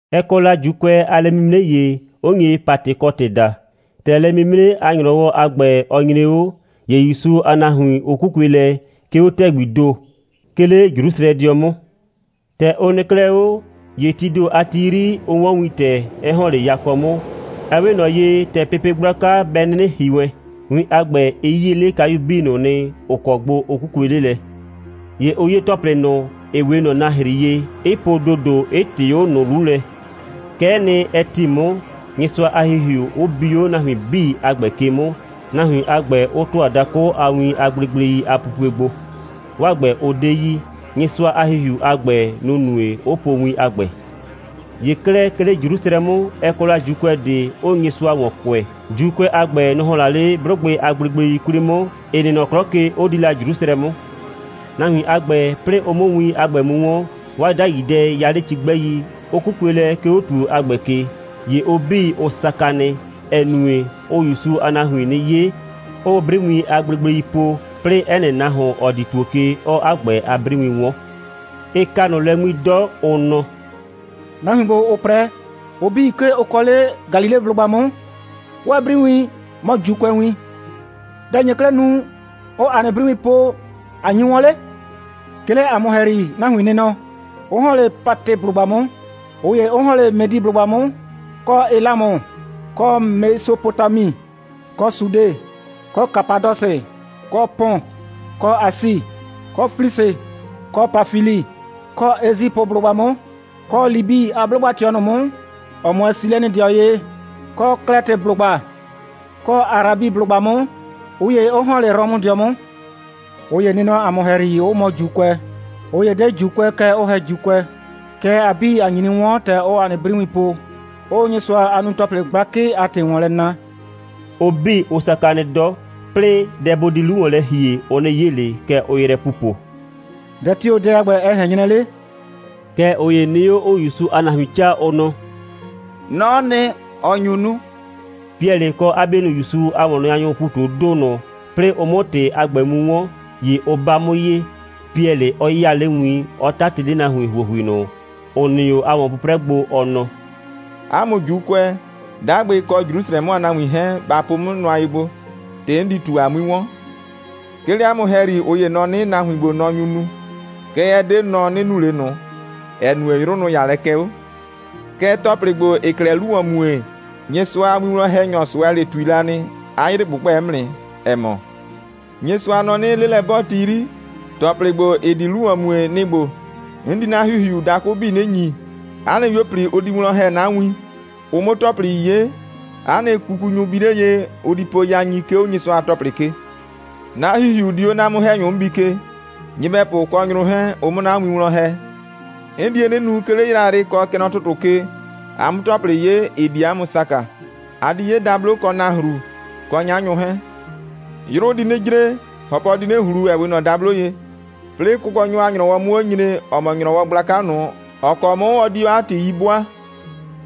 Ɛ kɔ la ‑Juukʋɛ a lɛ'mimre ‑ye, 'ʋ nye Patɩkɔtɩ daa. ‑Tɛ lɛ'mimre a ‑nyrɔwɔ a ‑gbɛ, ɔ nyre 'o, ‑ye ‑Yusu a nahuin, ʋ 'kukue lɛ, 'ke 'o ‑tɛgbii ‑do, 'ke 'le Jrusrɛdɩɔ 'mʋ. ‑Tɛ ʋ nɩ 'klɛɛ 'o, ‑ye tii ‑do a ti 'yri, ʋ 'wɔn wintɛ, 'ɛ ‑hɔn 'le yakɔ 'mʋ, ‑ɛ 'we ꞊nɔ ye, ‑tɛ pepe gblaka bɛ 'nɩnɩ ‑hi wɛn. Win a ‑gbɛ, ɩ 'yie 'le kayu 'bii ꞊nʋ nɩ, ‑ʋ kɔ gbo ʋ 'kukue 'le lɛ. ‑Ye ʋ 'ye ‑tɔplɩ ꞊nʋ, ‑ɩ 'we ꞊nɔ nahri ye, 'ɩ po ‑dodo, 'ɩ ꞊tɩɩ 'o ꞊nʋ 'lu lɛ. Kɛ'ɛ nɩ, ɛ ‑ti 'mʋ, Nyɩsʋa a ‑Hihiu 'ʋ bi 'o nahuin 'bii a ‑gbɛ ke 'mʋ, nahuin a ‑gbɛ 'ʋ ‑tʋa dakʋ a win a gblegblei a pupue gbo, 'waa ‑gbɛ, ʋ 'de yi. Nyɩsʋa a ‑Hihiu a ‑gbɛ, nʋ‑ nue, 'ʋ po win a ‑gbɛ. ‑Ye 'klɛɛ, 'ke 'le Jrusrɛ 'mʋ, ɛ kɔ la ‑Juukʋɛ ꞊de, ‑ʋʋ Nyɩsʋa ‑wɔn kʋɛ. ‑Juukʋɛ a ‑gbɛ, nʋ‑ ‑hɔn la 'le 'blʋgbɩ a gblegblei 'kwli 'mʋ, ‑ɩ nɩ nɔ 'klɔ ke, 'ʋ di la Jrusrɛ 'mʋ. Nahuin a ‑gbɛ, 'plɩɩ ʋ 'mʋ win a ‑gbɛ mu 'wɔn, 'waa 'dai dɛ 'ʋ ya 'le cigbɛi, 'ʋ 'kukue lɛ, 'ke 'o ‑tuo a ‑gbɛ ke. ‑Ye ʋ 'bii, ʋ saka nɩ, ‑ɛ nue, ʋʋ ‑Yusu a nahuin 'nɩ 'ye, 'ʋʋ 'briwiin a gblegblei po, 'plɩɩ 'ɛ nɩ nahuon, ‑ɔ di ‑tuo ke, 'ɔɔ 'a ‑gbɛ a 'briwin 'wɔn. Ɩ ka ꞊nʋ lɛ 'ŋmi 'dɔ, ʋ nɔ: «Nahuin ‑gbo, ‑ʋʋ 'prɛ, ʋ 'bii, 'ke ʋ kɔ 'le Galileblʋgba 'mʋ. 'Waa 'briwin mɔ ‑Juukʋɛwin. Dɛ‑ nye 'klɛɛ nu, 'ʋʋ ‑a nɩ 'briwiin po, ꞊a nyi 'wɔn 'le? 'Ke 'le ‑a mʋ ‑hɛyri nahuin nɩ nɔ, 'ʋ ‑hɔn 'le Patɩblʋgba 'mʋ, ꞊ʋ ‑ye 'ʋ ‑hɔn 'le Mɛdɩblʋgba 'mʋ, kɔ Elamʋ, kɔ Mesopotami, kɔ Sude, kɔ Kapadɔsɩ, kɔ Pɔn, kɔ Asi, kɔ Flisi, kɔ Pafili, kɔ Esipʋblʋgba 'mʋ, kɔ Libi a 'blʋgba꞊tɩɔ ꞊nʋ 'mʋ, ‑ɔ 'mʋɛɛ Silɛnɩdɩɔ ye, kɔ Klɛtɩblʋgba kɔ Arabiblʋgba 'mʋ, ꞊ʋ ye 'ʋ ‑hɔn 'le Rɔmʋdɩɔ 'mʋ. ꞊Ʋ ‑ye nɩ nɔ ‑a mʋ ‑hɛyri, 'ʋ mɔ ‑Juukʋɛ. ꞊Ʋ ‑ye 'de ‑Juukʋɛ, kɛɛ ʋ ‑hɛ ‑Juukʋɛ. Kɛɛ, ‑a 'bii, ‑a nyi 'nɩ 'wɔn, ‑tɛ ʋʋ ‑a nɩ 'briwiin po, 'ʋʋ Nyɩsʋa a nunu‑tɔplɩ gblakɩ a ‑tɩ ‑wɔn lɛ na.» Ʋ 'bii, ʋ saka nɩ 'dɔ, 'plɩɩ, dɛ bʋ di 'lu ‑wɔn lɛ ‑hie, ʋ 'nɩ 'ye ꞊le. Kɛ ʋʋ yrɛ pupo: «Dɛ tio‑ dɛ a ‑gbɛ, ɛ ꞊hɛn 'nyrɛ 'le?» Kɛɛ, ꞊ʋ ‑ye nɩ 'o, 'ʋʋ ‑Yusu a nahuin 'caa, ʋ nɔ: «Nɔ'ɔ nɩ, ‑ɔ nyu nu.» Piɛlɩ kɔ 'a 'bienʋ ‑Yusu a ‑wɔnnaanyʋʋ ‑pu ꞊tu 'o ‑do ꞊nʋ, 'plɩɩ ʋ 'mʋ ‑tɩ a ‑gbɛ mu 'wɔn, ‑ye ʋ 'ba 'mʋ ye, Piɛlɩ 'ɔ 'yaa 'le win, 'ɔ 'tatɩ 'le nahuin ‑huohui ꞊nʋ, ‑ʋ nɩ 'o, a ‑wɔn'prɛɛlɛ gbo, ɔ nɔ: «'A mʋ ‑Juukʋɛ, 'dagbɩ kɔ Jrusrɛ 'mʋ a nahuin 'hɛɛn, ba po 'mʋ nʋa ye gbo, ‑tɩ 'n di ꞊tu, a 'mui 'wɔn. 'Ke 'le 'a mʋ ‑hɛyri, ꞊ʋ ‑ye nɔ 'nɩ, nahuin ‑gbo, nɔ nyu nu. Kɛɛ, ɛ 'de nɔ, ɔ 'nɩ nu ꞊le ꞊nʋ, ‑ɛ nue, 'yrʋ, nʋ‑ 'ya lɛ kɛ 'o. Kɛɛ, ‑tɔplɩ ‑gbo, ‑ɩɩ 'klɛɛ 'lu ‑wɔn mue, Nyɩsʋa a winwlɔn‑hɛnyɔ Sʋɛlɩ ꞊tui la nɩ, 'a 'yrɩ ꞊gbʋgbɛ 'mʋ nɩ, ‑ɛ mɔ: Nyɩsʋa nɔ 'nɩ, 'lelɛ'bɔɔti 'yri, ‑tɔplɩ ‑gbo, ‑ɩ di 'lu ‑wɔn mue, ɩ nɩ‑ ‑gbo: 'N di 'na ‑Hihiu dakʋ 'bii 'nɩ ‑nyi. 'A nɩ 'yuo꞊pli, ʋ di wlɔn ‑hɛ 'na win, ʋ 'mʋ ‑tɔplɩ 'ye, 'a nɩ kukunyʋ bi 'le ye, ʋ di po yain, 'ke 'o Nyɩsʋa a ‑tɔplɩ ke. 'Na ‑Hihiu di 'o 'na 'mʋ‑hɛnyʋ 'mʋ bi ke, nyɩbɛpʋ kɔ nyrʋ 'hɛɛn, ʋ 'mʋ 'na win wlɔn ‑hɛ. 'N die 'nɩ nu, 'ke 'le yrayrɩ kɔ kɛ nɔ ‑tʋtʋ ke, a 'mʋ ‑tɔplɩ 'ye, ‑ɩ di 'a mʋ saka. A di 'ye dablo, kɔ nahru, kɔ 'nyanyʋ 'hɛɛn. 'Yrʋ di 'nɩ jre, ‑hɔpɔ di 'nɩ ꞊hlu, ‑ɛ 'we ꞊nɔ dablo ye, 'plɩɩ Kʋkɔnyɔ a ‑nyrɔwɔ 'mʋ 'o nyre, ‑ɔ mɔ ‑nyrɔwɔ gblaka ꞊nʋ, ‑ɔ kɔ 'mʋ ɔ di 'o 'a ‑tɩ 'yi 'bʋaa.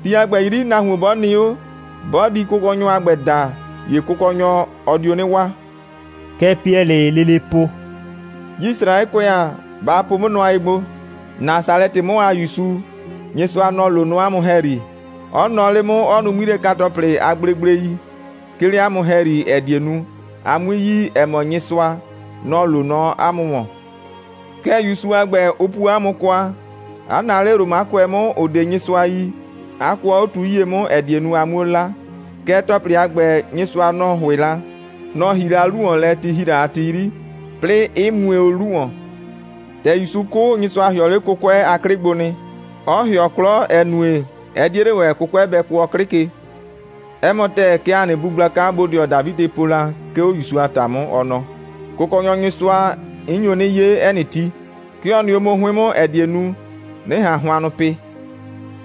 Ti a ‑gbɛ 'yri, nahuon 'bɔ nɩ 'o, 'bɔ di Kʋkɔnyɔ a ‑gbɛ da, ‑ye Kʋkɔnyɔ, ɔ dio 'nɩ waa.» Kɛ Piɛlɩɩ lele po: «Yisraɛkʋɛ ‑a, ba po 'mʋ nʋa ye gbo: Nasalɛtɩ 'mʋ a ‑Yusu, Nyɩsʋa, nɔ‑ loo nɔ 'a mʋ ‑hɛyri, 'ɔ nɔɔ 'le 'mʋ, 'ɔ nu 'ŋmilɛka‑tɔplɩ a gblegblei, 'ke 'le 'a mʋ ‑hɛyri, ‑ɛ die nu, a 'mui yi, ‑ɛ mɔ Nyɩsʋa, nɔ‑ loo nɔ 'a mʋ ‑wɔn. Kɛɛ, ‑Yusu a ‑gbɛ, ʋ puo 'a mʋ kwa, 'a naa 'le Romakʋɛ 'mʋ, ‑ʋ 'de Nyɩsʋa yi, 'a kʋɔ 'o tu 'yie 'mʋ, ‑ɛ die nu, a 'muo 'la. Kɛɛ, ‑tɔplɩ a ‑gbɛ, Nyɩsʋa, nɔ‑ ‑hʋɩ la, nɔ‑ ‑hii la 'lu ‑wɔn lɛ, ti ‑hi la a ti 'yri, 'plɩɩ, 'ɩ mue o 'lu ‑wɔn. ‑Tɛ ‑Yusu 'kʋ, Nyɩsʋa ‑hɩɔ 'le 'kʋkʋɛ a 'klɩ gbo nɩ, 'ɔ ‑hɩɔ 'klɔ, ‑ɛ nue, ɛ 'die 'le ‑wɛ, 'kʋkʋɛ bɛ kʋɔ 'klɩ ke. 'Ɛ mɔ ‑tɛɛ, kɛ ‑a nɩ bu gblaka bodɩɔ Dafidɩ po la, 'ke 'o ‑Yusu a ‑ta 'mʋ, ɔ nɔ: Kʋkɔnyɔ Nyɩsʋa, 'n nyo 'nɩ 'ye 'ɛ nɩ ti. 'Ke ɔ nɩ 'o 'mʋ 'hʋɩn 'mʋ, ‑ɛ die nu, 'nɩ ꞊han hʋannʋ pɩ.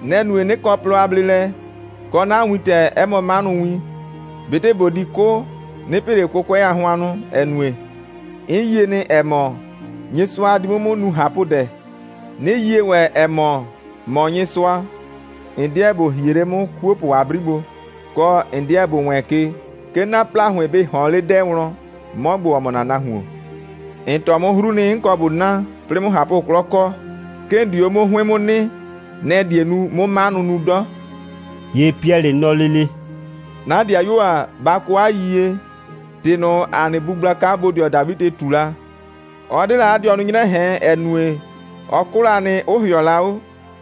Nɛ‑ nue, 'nɩ kɔ plɔ a bleelɛ, kɔ, 'na wintɛ 'ɛ mɔ 'manʋwin. ꞊Betɩ ꞊bo di 'kʋ, 'nɩ pɩ ꞊le 'kʋkʋɛ a hʋannʋ, ‑ɛ nue, 'n yie nɩ, ‑ɛ mɔ, Nyɩsʋa di 'mʋ 'mʋ nu ꞊hapʋdɛ, 'nɩ yie ‑wɛ, ‑ɛ mɔ, ‑mɔ Nyɩsʋa, ‑n 'deɛ ‑bo hie 'le 'mʋ 'kuopʋ a 'bri gbo, kɔ, ‑n 'deɛ ‑bo wɛɛn ke, 'ke 'na ‑plahʋɩn bɩ ꞊hɔɔn 'le 'dɛɛ wlɔn, 'mɔ ‑gbo, ‑ɔ mɔ ‑na nahuon. ‑N tɔɔ 'mʋ 'hru nɩ, 'n kɔ ꞊bo na, 'plɩɩ 'mʋ ꞊hapʋ'klɔ kɔ. 'Ke ‑n di 'o 'mʋ 'hʋɩn 'mʋ nɩ. Nɛ‑ die nu, 'mʋ 'manʋ nu 'dɔ.» ‑Ye Piɛlɩ nɔ lele: «'Na ‑dɩayuo ‑a, ba kɔ 'a yiyie, ‑tɩ ꞊nʋ, ‑a nɩ bu gblaka bodɩɔ Dafidɩ ꞊tu la, ɔ 'de la 'a dɩɔnʋ 'nyrɛ ꞊hɛn, ‑ɛ nue, ɔ 'kʋ la nɩ, 'ʋ ‑hɩɔ la 'o.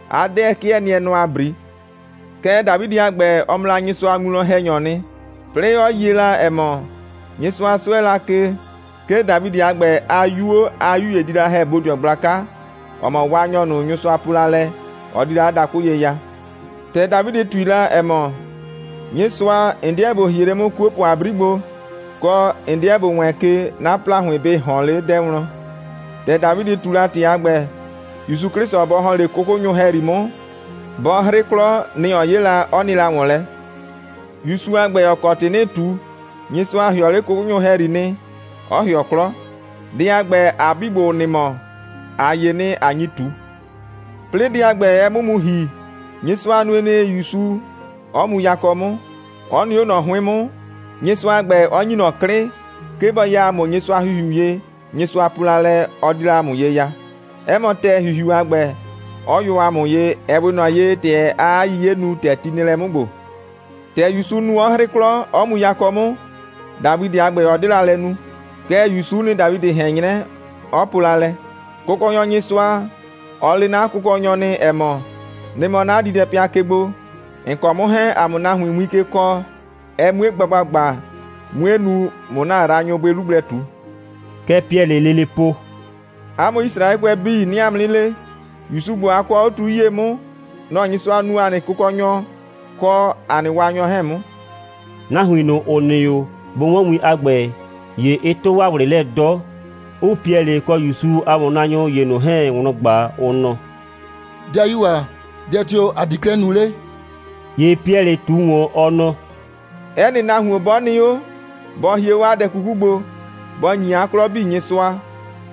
'A 'dɛɛ 'kɩɛ nɩɛ nɔ ‑a 'bri. Kɛɛ, Dafidɩ a ‑gbɛ, ɔ mɔ la Nyɩsʋa a winwlɔn‑hɛnyɔɔ nɩ, 'plɩɩ 'ɔ yie la, ‑ɛ mɔ, Nyɩsʋa 'sʋɛ la ke, 'ke Dafidɩ a ‑gbɛ a 'yuo a 'yu ‑ye di la ‑hɛ bodɩɔ gblaka, ‑ɔ mɔ Waanyɔ ꞊nʋ, Nyɩsʋa po la lɛ, ɔ di la 'a dakʋ ye ya. ‑Tɛ Dafidɩ ꞊tui la, ‑ɛ mɔ: Nyɩsʋa, ‑n 'deɛ ‑bo hie 'le 'mʋ 'kuopʋ a 'bri gbo, kɔ, ‑n 'deɛ ‑bo wɛɛn ke, 'na ‑plahʋɩn bɩ ꞊hɔɔn 'le 'dɛɛ wlɔn, ‑tɛ Dafidɩ ꞊tu la ‑tɩ a ‑gbɛ, ‑Yusu 'Klɩsʋ bɔ ‑hɔn 'le 'kʋkʋnyʋ ‑hɛyri 'mʋ, bɔ 'hrɩ 'klɔ, nɛ‑ ɔ 'ye la, 'ɔ nɩ la ‑wɔn lɛ. ‑Yusu ‑gbo, ‑ɔ kɔ ‑tɩ 'nɩɩ ꞊tu, Nyɩsʋa ‑hɩɔ 'le 'kʋkʋnyʋ ‑hɛyri 'mʋ nɩ, 'ɔ ‑hɩɔ 'klɔ. Dɛ a ‑gbɛ, ‑a 'bii ‑gbo, ‑ʋ nɩ mɔ, ‑a 'ye nɩ, ꞊a nyi ꞊tu. 'Plɩɩ dɛ a ‑gbɛ, ɛ 'mʋ mu ‑hi, Nyɩsʋa nue nɩ, ‑Yusu 'ɔ mu yakɔ 'mʋ, 'ɔ nɩ 'o ꞊nɔ 'hʋɩn 'mʋ, Nyɩsʋa a ‑gbɛ 'ɔ ‑nyi ꞊nɔ 'klɩ, 'ke bɔ ya ‑a mʋ Nyɩsʋa a ‑Hihiu ye, Nyɩsʋa po la lɛ, ɔ di la ‑a mʋ ye ya, 'ɛ mɔ ‑tɛɛ, ‑Hihiu a ‑gbɛ, 'ɔ yʋ ‑a mʋ ye, ‑ɛ 'we ꞊nɔ ye, ‑tɛ aa 'a 'yiye nu, ‑tɛ ti nɩ lɛ 'mʋ ‑gbo. ‑Tɛ ‑Yusu nu, 'ɔ 'hrɩ 'klɔ, 'ɔ mu yakɔ 'mʋ, Dafidɩ a ‑gbɛ, ɔ 'de la lɛ nu. Kɛɛ, ‑Yusu'u nɩ, Dafidɩ ꞊hɛn 'nyrɛ, 'ɔ po la lɛ: Kʋkɔnyɔ Nyɩsʋa, ɔ le 'na Kʋkɔnyɔ nɩ, ‑ɛ mɔ: Nɩ mɔ 'na diidɛpɩa ke gbo, ‑n kɔ 'mʋ 'hɛɛn, ‑a 'mʋ nahuin win ke kɔɔ, ɛ 'mue gba ‑gbagba, 'mue nu, ꞊mʋ ‑na yraanyʋ bʋɩ 'lu gblɛ ꞊tu.» Kɛ Piɛlɩɩ lele po: «'A mʋ Yisraɛkʋɛ 'bii, 'nɩɩ 'a mʋ 'nɩ le: ‑Yusu ‑gbo, a kɔɔ o 'o tu 'yie 'mʋ, nɔ‑ Nyɩsʋa nuu ‑a nɩ Kʋkɔnyɔ kɔ ‑a nɩ Waanyɔ 'hɛɛn 'mʋ.» Nahuin ꞊nʋ, ‑ʋ nɩ 'o, bʋ 'wɔn win a ‑gbɛ, ‑ye ɩ 'tʋ 'waa ꞊wlɩ lɛ 'dɔ, 'ʋʋ Piɛlɩ kɔ ‑Yusu a ‑wɔnnaanyʋ ‑ye ꞊nʋ 'hɛɛn wlɔn ꞊gba, ʋ nɔ: «'Dɩayuo ‑a, dɛ tio‑ ‑a di 'klɛɛ nu 'le?» ‑Ye Piɛlɩ ꞊tu ‑wɔn, ɔ nɔ: «'Ɛ nɩ nahuon 'bɔ nɩ 'o, bɔ hie 'o 'a dɛ 'kuku gbo, bɔ ‑nyi 'a 'klɔ 'bii Nyɩsʋa,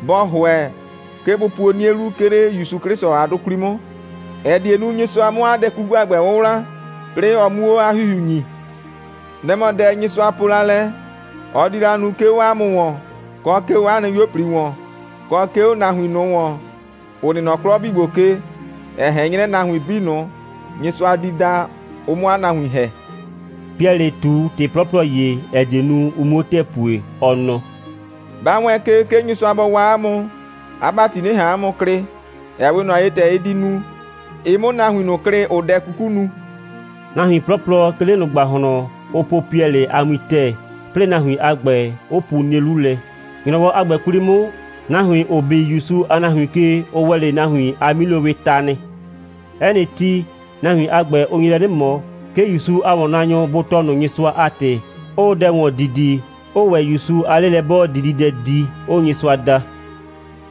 bɔ ‑hʋɛ, 'ke bʋ puo 'nie 'lu, 'ke 'le ‑Yusu 'Klɩsʋ a 'dʋ 'kwli 'mʋ, ‑ɛ die nu, Nyɩsʋa 'mʋ 'a dɛ 'kuku a ‑gbɛ 'wʋwla, 'plɩɩ ɔ 'muo 'a ‑Hihiu ‑nyi. Nɛ‑ mɔ dɛ, Nyɩsʋa po la lɛ, ɔ di la nu, 'ke 'o 'a mʋ ‑wɔn, kɔ 'ke 'o 'a nɩ 'yuo꞊pli ‑wɔn, kɔ 'ke 'o nahuin ꞊nʋ ‑wɔn, ‑ʋ nɩ nɔ 'klɔ 'bii ‑gbo ke, ‑ɛ ꞊hɛn 'nyrɛ, nahuin 'bii ꞊nʋ, Nyɩsʋa di da, ʋ 'mʋ 'a nahuin ‑hɛ.» Piɛlɩ ꞊tu ‑tɩ 'plɔplɔ ‑ye, ‑ɛ die nu, ʋ 'muo ‑tɛɛ pue, ɔ nɔ: «Ba wɛɛn ke, 'ke Nyɩsʋa bɔ waa 'a mʋ, 'a ‑bati 'nɩ ꞊han 'a mʋ klɩ, ‑ɛ 'we ꞊nɔ ye, ‑tɛ ɩ di nu, ɩ 'mʋ nahuin ꞊nʋ klɩ, ‑ʋʋ dɛ 'kuku nu.» Nahuin 'plɔplɔ 'ke 'le ꞊nʋ ‑gbahlɔn, ʋ po Piɛlɩ a win ‑tɛɛ, 'plɩɩ nahuin a ‑gbɛ, 'ʋ pu 'nie 'lu lɛ. ‑Nyrɔwɔ a ‑gbɛ 'kwli 'mʋ, nahuin, ‑ʋ bi ‑Yusu a nahuin ke, ʋ ‑wɛ 'le nahuin a 'milowɩɩ ta nɩ. 'Ɛ nɩ ti, nahuin a ‑gbɛ, ʋ nye lɛ 'nɩ ꞊mɔ, 'ke ‑Yusu a ‑wɔnnaanyʋ bʋ tɔɔ ꞊nʋ Nyɩsʋa a ‑tɩ, 'ʋʋ dɛ ‑wɔn didi, 'ʋʋ ‑wɛ ‑Yusu a 'lelɛ'bɔɔdididɛ di, 'ʋʋ Nyɩsʋa da.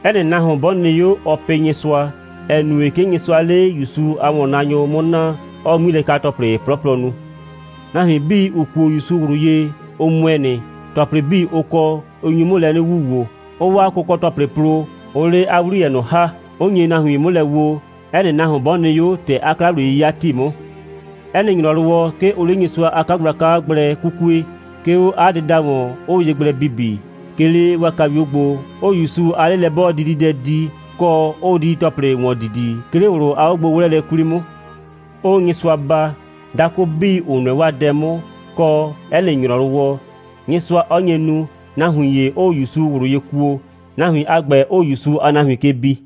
'Ɛ nɩ nahuon 'bɔ nɩ 'o, ɔɔ pɩ Nyɩsʋa, ‑ɛ nue, 'ke Nyɩsʋaa 'le ‑Yusu a ‑wɔnnaanyʋ 'mʋ naa, 'ɔɔ 'ŋmilɛka‑tɔplɩ 'plɔplɔ nu. Nahuin 'bii, ‑ʋ kuo ‑Yusu ꞊wlʋ ye, ʋ ‑mʋɛ nɩ, ‑tɔplɩ 'bii, ʋ kɔ, 'ʋ nyi 'mʋ lɛ wuwoo, 'ʋʋ 'waa kʋkɔ‑tɔplɩ plo, 'ʋʋ 'le 'a 'wliyɛ ꞊nʋ ‑ha, 'ʋ nye nahuin 'mʋ lɛ woo, 'ɛ nɩ nahuon 'bɔ nɩ 'o, ‑tɛ 'a 'kla‑wliye'yɩya ‑ti 'mʋ. 'Ɛ nɩ ‑nyrɔwɔ, 'ke ʋʋ 'le Nyɩsʋa a 'kagblaka gblɛ 'kukue, 'ke 'o 'a dɩda ‑wɔn, 'ʋʋ ye gblɛ bibi, 'ke 'le 'waa kayuo gbo, 'ʋʋ ‑Yusu a 'lelɛ'bɔɔdididɛ di, kɔ, 'ʋʋ didi‑tɔplɩ ‑wɔn didi, 'ke 'le ꞊wlʋ a 'ogbo'wlɛɛlɛ 'kwli 'mʋ, 'ʋʋ Nyɩsʋa baa, dakʋ 'bii 'ʋ nʋɛ 'waa dɛ 'mʋ, kɔ, 'ɛ nɩ ‑nyrɔwɔ, Nyɩsʋa 'ɔ nye nu, nahuin ‑ye 'ʋʋ ‑Yusu ꞊wlʋ ye kuo, nahuin a ‑gbɛ 'ʋʋ ‑Yusu a nahuin ke bi.